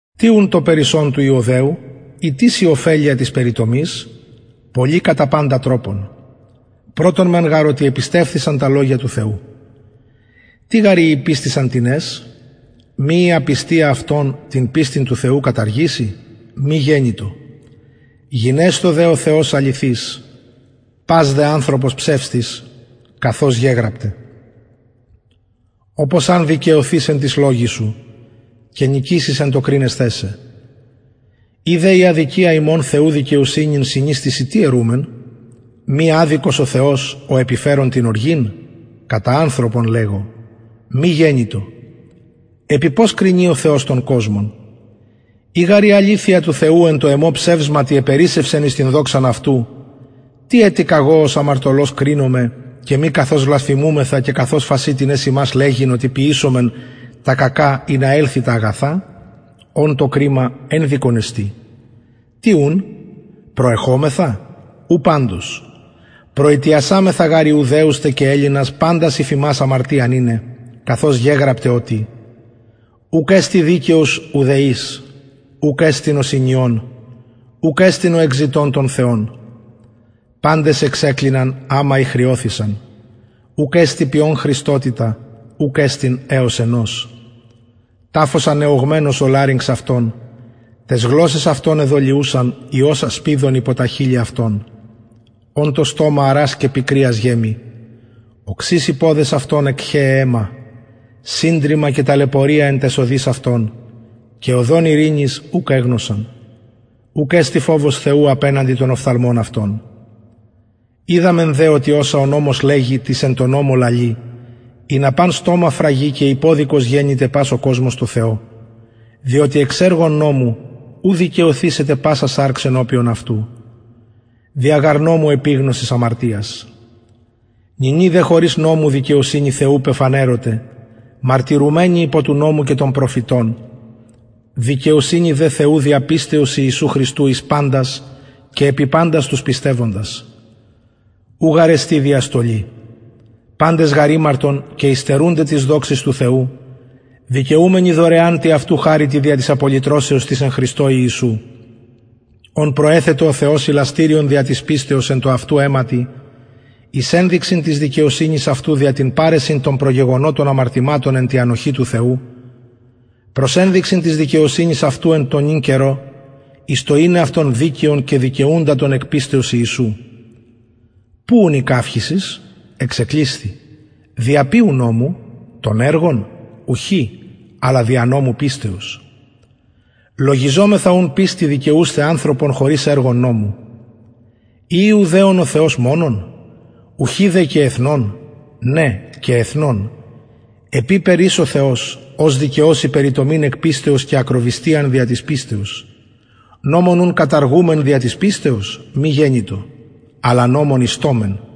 τι ουν το περισσον του ιουδαιου η τις η ωφελεια της περιτομης πολυ κατα παντα τροπον πρωτον μεν γαρ οτι επιστευθησαν τα λογια του θεου τι γαρ ει ηπιστησαν τινες μη η απιστια αυτων την πιστιν του θεου καταργησει μη γενοιτο γινεσθω δε ο θεος αληθης πας δε ανθρωπος ψευστης καθως γεγραπται οπως αν δικαιωθης εν τοις λογοις σου και νικησης εν τω κρινεσθαι σε ει δε η αδικια ημων θεου δικαιοσυνην συνιστησιν τι ερουμεν μη αδικος ο θεος ο επιφερων την οργην κατα ανθρωπον λεγω μη γενοιτο επει πως κρινει ο θεος τον κοσμον ει γαρ η αληθεια του θεου εν τω εμω ψευσματι επερισσευσεν εις την δοξαν αυτου τι ετι καγω ως αμαρτωλος κρινομαι και μη καθως βλασφημουμεθα και καθως φασιν τινες ημας λεγειν οτι ποιησωμεν τα κακα ινα ελθη τα αγαθα ων το κριμα ενδικον εστιν τι ουν προεχομεθα ου παντως προητιασαμεθα γαρ ιουδαιους τε και ελληνας παντας υφ αμαρτιαν ειναι καθως γεγραπται οτι ουκ εστιν δικαιος ουδε εις ουκ εστιν ο συνιων ουκ εστιν ο εκζητων τον θεον παντες εξεκλιναν αμα ηχρειωθησαν ουκ εστιν ποιων χρηστοτητα ουκ εστιν εως ενος ταφος ανεωγμενος ο λαρυγξ αυτων ταις γλωσσαις αυτων εδολιουσαν ιος ασπιδων υπο τα χειλη αυτων ων το στομα αρας και πικριας γεμει οξεις οι ποδες αυτων εκχεαι αιμα συντριμμα και ταλαιπωρια εν ταις οδοις αυτων και οδον ειρηνης ουκ εγνωσαν ουκ εστιν φοβος θεου απεναντι των οφθαλμων αυτων οιδαμεν δε οτι οσα ο νομος λεγει τοις εν τω νομω λαλει ινα παν στομα φραγη και υποδικος γενηται πας ο κοσμος τω θεω διοτι εξ εργων νομου ου δικαιωθησεται πασα σαρξ ενωπιον αυτου δια γαρ νομου επιγνωσις αμαρτιας νυνι δε χωρις νομου δικαιοσυνη θεου πεφανερωται μαρτυρουμενη υπο του νομου και των προφητων δικαιοσυνη δε θεου δια πιστεως ιησου χριστου εις παντας και επι παντας τους πιστευοντας ου γαρ εστιν διαστολη παντες γαρ ημαρτον και υστερουνται της δοξης του θεου δικαιουμενοι δωρεαν τη αυτου χαριτι δια της απολυτρωσεως της εν χριστω ιησου ον προεθετο ο θεος ιλαστηριον δια της πιστεως εν τω αυτου αιματι εις ενδειξιν της δικαιοσυνης αυτου δια την παρεσιν των προγεγονοτων αμαρτηματων εν τη ανοχη του θεου προς ενδειξιν της δικαιοσυνης αυτου εν τω νυν καιρω εις το ειναι αυτον δικαιον και δικαιουντα τον εκ πιστεως ιησου που ουν η καυχησις εξεκλεισθη δια ποιου νομου των εργων ουχι αλλα δια νομου πιστεως λογιζομεθα ουν πιστει δικαιουσθαι ανθρωπον χωρις εργων νομου η ιουδαιων ο θεος μονον ουχι δε και εθνων ναι και εθνων επειπερ εις ο θεος ος δικαιωσει περιτομην εκ πιστεως και ακροβυστιαν δια της πιστεως νομον ουν καταργουμεν δια της πιστεως μη γενοιτο αλλα νομον ιστωμεν